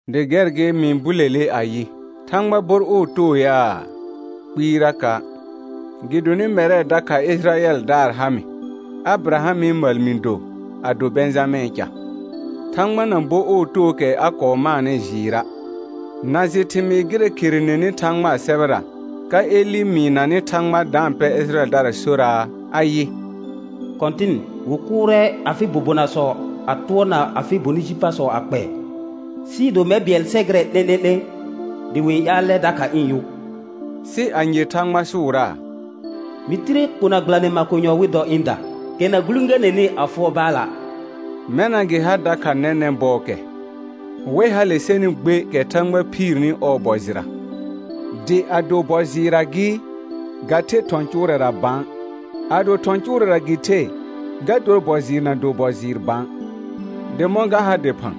Dɩ gɛr gɩ mɩ-n bulele ayɩ: Thãgba bor ɔɔ too yaa? Kpɩɩraka', gɩdonɩ mɛrɛ dakha Ɩjɩrayɛldaar ha mɩ, Abɩrahamɩ məl mɩ do, a do Bɛ̃jamɛ̃ɛ ca. Thãgba na bo ɔɔ tookɛ a kɔɔ maanɩ jɩɩra'. Na jɩ thɩmɩɩ gɩrɛ kherenenɩ Thãgbaa sɛbɛra, ka Elɩ mɩɩnanɩ Thãgba da-n pɛ Ɩjɩrayɛldara soraa, ayɩ: «Kɔ̃tɩn wɩ kʋʋrɛ afɩ bobonasɔ a tʋɔrna afɩ bonɩ ji pasɔ a kpɛɛ, sɩɩ do mɛr bɩɛl sɛ gɩrɛ 'lẽ'lẽ'lẽ dɩ wɩ-n ƴaalɛ dakha ɩ̃ yʋ.» Sɩ anye Thãgba sʋʋraa? «Mɩ tire kona gbɩlanɩ makonyɔ wɩ dɔ ɩ̃da, kɛ na gulẽganɛnɩ a fʋɔr Baala'.» Mɛna gɩ ha dakha nɛnɛ̃ bɔɔkɛ, wɛ hale sɛnɩ gbe kɛ Thãgba phiirni ɔɔ bɔ jɩra. Dɩ ado bɔ jɩɩrra gɩ, ga the thɔ̃ cʋʋrɛra bã; ado thɔ̃ cʋʋrɛra gɩ the, ga dor bɔ jɩɩr na do bɔ jɩɩr bã. Dɩ mɔ̃ ga ha dɩphã?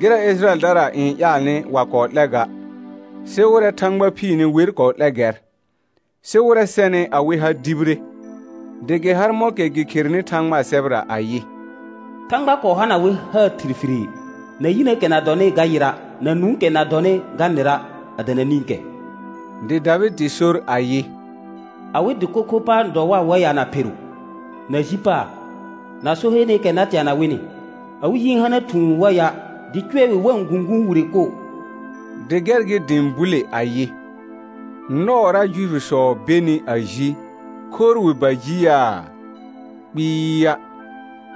Gɩrɛ Ɩjɩrayɛldara n ƴaalnɩ wa kɔɔ 'lɛ ga, sɩ wɩrɛ Thãgba phiirni wer kɔɔ 'lɛ gɛr; sɩ wɩrɛ sɛnɩ awɩ ha dibire. Dɩ gɩ har mɔ̃kɛ gɩ kherenɩ Thãgbaa sɛbɛra ayɩ: «Thãgba kɔɔ hana wɩ haar thirfirii, na yinəəkɛ na dɔnɩ ga yɩra', na nũukɛ na dɔnɩ ga nɩra', a dana nĩkɛ.» Dɩ Davɩdɩ sor ayɩ: «Awɩ dɩko kho pa n dɔ war waya na pheru, na ji paar, na so heeneekɛ na teana wɩnɩ. Awɩ yi n hana thũu wa ya', dɩ cʋɛ wɩ wa-n gũguun wire koo.» Dɩ gɛr gɩ dɩ ɩ̃ bule ayɩ: Nɔɔra Juifisɔ benɩ a ji, khorr wɩ ba ji yaa? Kpɩɩa'.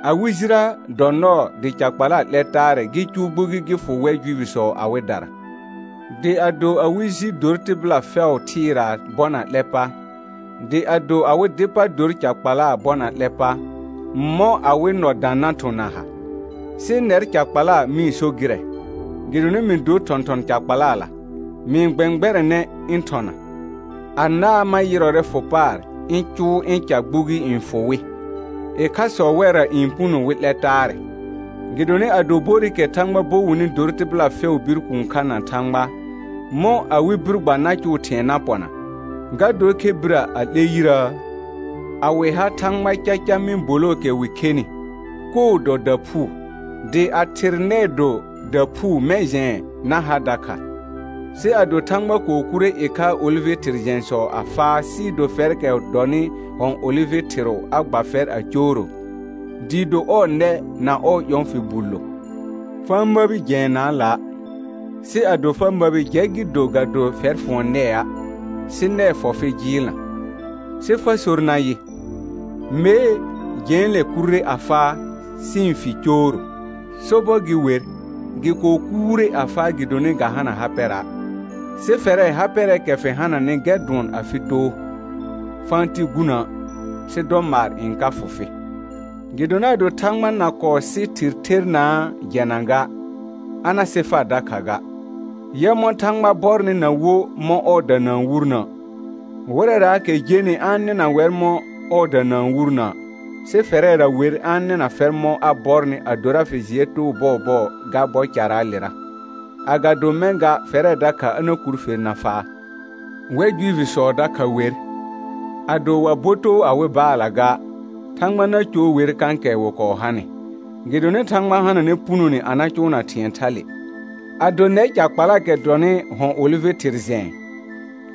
Awɩ jirə dɔ nɔɔ dɩ ca kpala 'lɛ taarɛ gɩ cʋʋ gbugi gɩ fʋ wɛr Juifisɔ awɩdara. Dɩ ado awɩ ji dor tɩbɩla fɛʋ thɩɩraa bɔna 'lɛ pa, dɩ ado awɩ dɩ pa dor ca kpalaa bɔna 'lɛ pa, mɔ̃ awɩ nɔ dã na thʋ̃ na ha? Sɩ nɛr ca kpala mɩ-n so gɩrɛ: Gɩdonɩ mɩ dor thɔ̃thɔn ca kpalala, mɩ-n gbɛ̃gbɛrɛnɛ ɩ̃ thɔna, anaa ma yɩrɔrɛ fʋ paar ɩ̃ cʋʋ ɩ̃ ca gbugi n fʋ wɩ, ɩkhasɔ wɛrra n puno wɩ 'lɛ taarɛ. Gɩdonɩ ado borɩkɛ Thãgba bo wɩnɩ dor tɩbɩla fɛʋʋ bir kũu kha na Thãgba, mɔ̃ awɩ bir gba na cʋʋ thɩ̃ɛ na pɔna, ga dor khe birə a 'lɛ yirəə? A wɩ ha Thãgba caca mɩ̃ bolookɛ wɩ khenɩ, koo dɔ daphuu, dɩ a thɩr nɛɛ do daphuu mɛ̃ jɛ̃ɛ na ha dakha. Sɩ ado Thãgba kɔɔ kurre ɩkhaa olɩvɩ thɩr jɛ̃sɔ a faa sɩɩ do fɛrkɛ dɔnɩ hɔ̃ olɩvɩ thɩrʋ a gba fɛr a cooro, dɩɩ do ɔɔ nɛ na ɔɔ ƴɔ̃ fɩ bullo, fa-n məbi jɛɛnaala'; sɩ ado fa məbi jɛ gɩ do ga do fɛr fʋɔn nɛa', sɩ nɛɛ fɔ fɩ jɩɩlna. Sɩ fa sor nayɩ: Mee, jɛ̃ɛle kurre a faa sɩ ɩ̃ fi ɩ̃ cooro. Sobɔr gɩ wer, gɩ kɔɔ kuurre a faa gɩdonɩ ga hana ha pɛra', sɩ fɛrɛ ha pɛrɛɛkɛ fɩ hananɩ gɛr dʋɔn afɩ too. Fa-n ti gunə', sɩ dɔ maar n ka fʋ fɩ. Gɩdonɩ ado Thãgba na kɔɔ sɩ thɩr thernaa jɛna ga, a na sɩ far dakha ga. Yɛ mɔ̃ Thãgba bɔrnɩ na wo mɔ̃ ɔɔda na-n wurnə': Wɩrɛraakɛ jenɩ a-n nɩna wɛr mɔ̃ ɔɔda na-n wurnə', sɩ fɛrɛra wer a-n nɩna fɛr mɔ̃ a bɔrnɩ adora fɩ jɩɛ too bɔɔbɔɔ ga bɔ caraalera, agado mɛ̃ ga fɛrɛ dakha a na kur fer na faa. Wɛr Juifisɔ dakha wer, ado wa bo too awɩ baalla ga, Thãgba na coor wer kãkɛ wɩ kɔɔ hanɩ, gɩdonɩ Thãgba hananɛ punone a na cʋʋna thɩ̃ɛ thale. Ado nɛr ca kpalaakɛ dɔnɩ hɔ̃ olɩvɩ thɩr jɛ̃ɛ,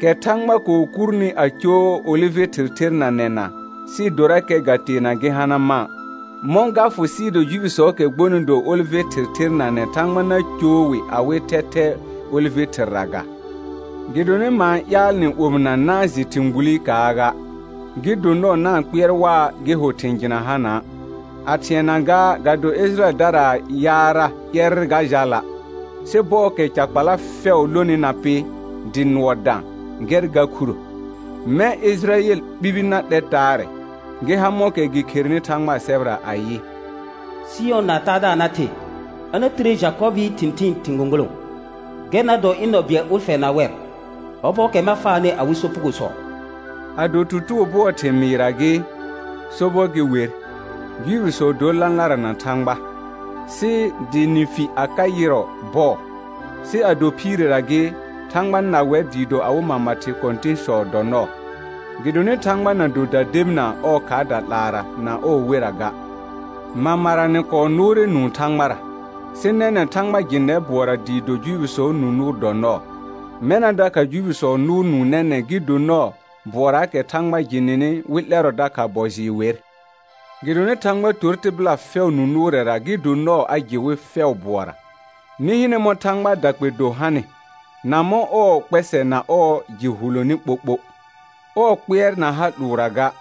kɛ Thãgba kɔɔ kurni a coor olɩvɩ thɩr thernanɛna sɩɩ dorakɛ ga teena gɩ hana mã', mɔ̃ ga fʋ sɩɩ do Juifisɔɔkɛ gbonɩ do olɩvɩ thɩr thernanɛ Thãgba na coor wɩ awɩ thɛthɛɛ olɩvɩ thɩrra ga? Gɩdonɩ ma-n ƴaal nɩ omɩna na-n jɩ thɩ̃ gbulikaa ga, gɩ do nɔɔ na-n kpɩɛr waa gɩ ho thɩ̃ jɩna hana'; a thɩɛna gaa ga do Ɩjɩrayɛldaraa yaarra ƴɛrr ga jala', sɩ bɔɔkɛ ca kpala fɛʋ lonɩ na pɩ, dɩ nʋɔ dã, gɛr ga khuro; mɛ̃ Ɩjɩrayɛl ɓibi na 'lɛ taarɛ, gɩ ha mɔ̃kɛ gɩ kherenɩ Thãgbaa sɛbɛra ayɩ: «Sɩyɔna Taadaar na the, a na tire Jakɔbɩɩ thɩ̃thɩɩn thɩ̃ gõgolõ; gɛr na dɔ ɩ̃ nɔ bɩɛl ʋlfɛ na wɛr, ɔbɔɔkɛ ma faanɩ awɩ sopugosɔ.» Ado tutugo bʋɔɔ thɩmɩɩra gɩ, sobɔr gɩ wer, Juifisɔ dor lãlara na Thãgba, sɩ dɩ nɩ fi a ka yɩrɔ bɔɔ; sɩ ado phiirera gɩ, Thãgba na wɛr dɩɩ do awɩ mama thɩ kɔ̃tɩ̃sɔ dɔ nɔɔ. Gɩdonɩ Thãgba na do dadebinaa ɔɔ khaarda 'laara na ɔɔ wera ga. Mamara nɩ kɔɔ nʋʋrɛ nũu Thãgbara, sɩ nɛnɛ̃ Thãgba jɩ nɛr bʋɔra dɩɩ do Juifisɔɔ nũ nʋʋr dɔ nɔɔ. Mɛna dakha Juifisɔ nʋʋr nũu nɛnɛ̃ gɩ do nɔɔ bʋɔraakɛ Thãgba jɩ nɩnɩ wɩ 'lɛrɔ dakha bɔ jɩɩr wer. Gɩdonɩ Thãgba tor tɩbɩla fɛʋ nũ nʋʋrɛra gɩ do nɔɔ a jɩ wɩ fɛʋ bʋɔra. Nɩ hɩnɛ mɔ̃ Thãgbaa dakpɛ do hanɩ, na mɔ̃ ɔɔ kpɛsɛ na ɔɔ jɩ huloni ɓoɓo. Ɔɔ kpɩɛr na ha 'lʋʋrra ga;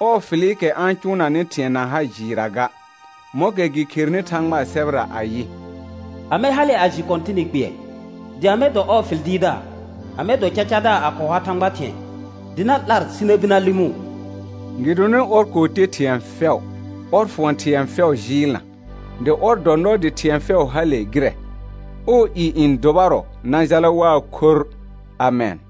ɔɔ fɩlɩkɛ a-n cʋʋnanɩ thɩ̃ɛ na ha jɩɩrra ga, mɔ̃kɛ gɩ kherenɩ Thãgbaa sɛbɛra ayɩ: «Amɛ hale a jɩ Kɔ̃tɩnɩ kpɩɛr? Dɩ amɛ dɔ ɔɔ fɩl dɩɩrdaar? Amɛ dɔ cacadaar a kɔɔ ha Thãgba thɩ̃ɛ, dɩ na 'lar sɩ na bir na lɩmʋʋ?» Gɩdonɩ ɔr kɔɔ te thɩ̃ɛ fɛʋ, ɔr fʋɔn thɩ̃ɛ fɛʋ jɩɩlna, dɩ ɔr dɔ nɔɔ dɩ thɩ̃ɛ fɛʋ hale gɩrɛ. Ɔɔ i n dʋbarɔ na jala waa khorr. Amɛn.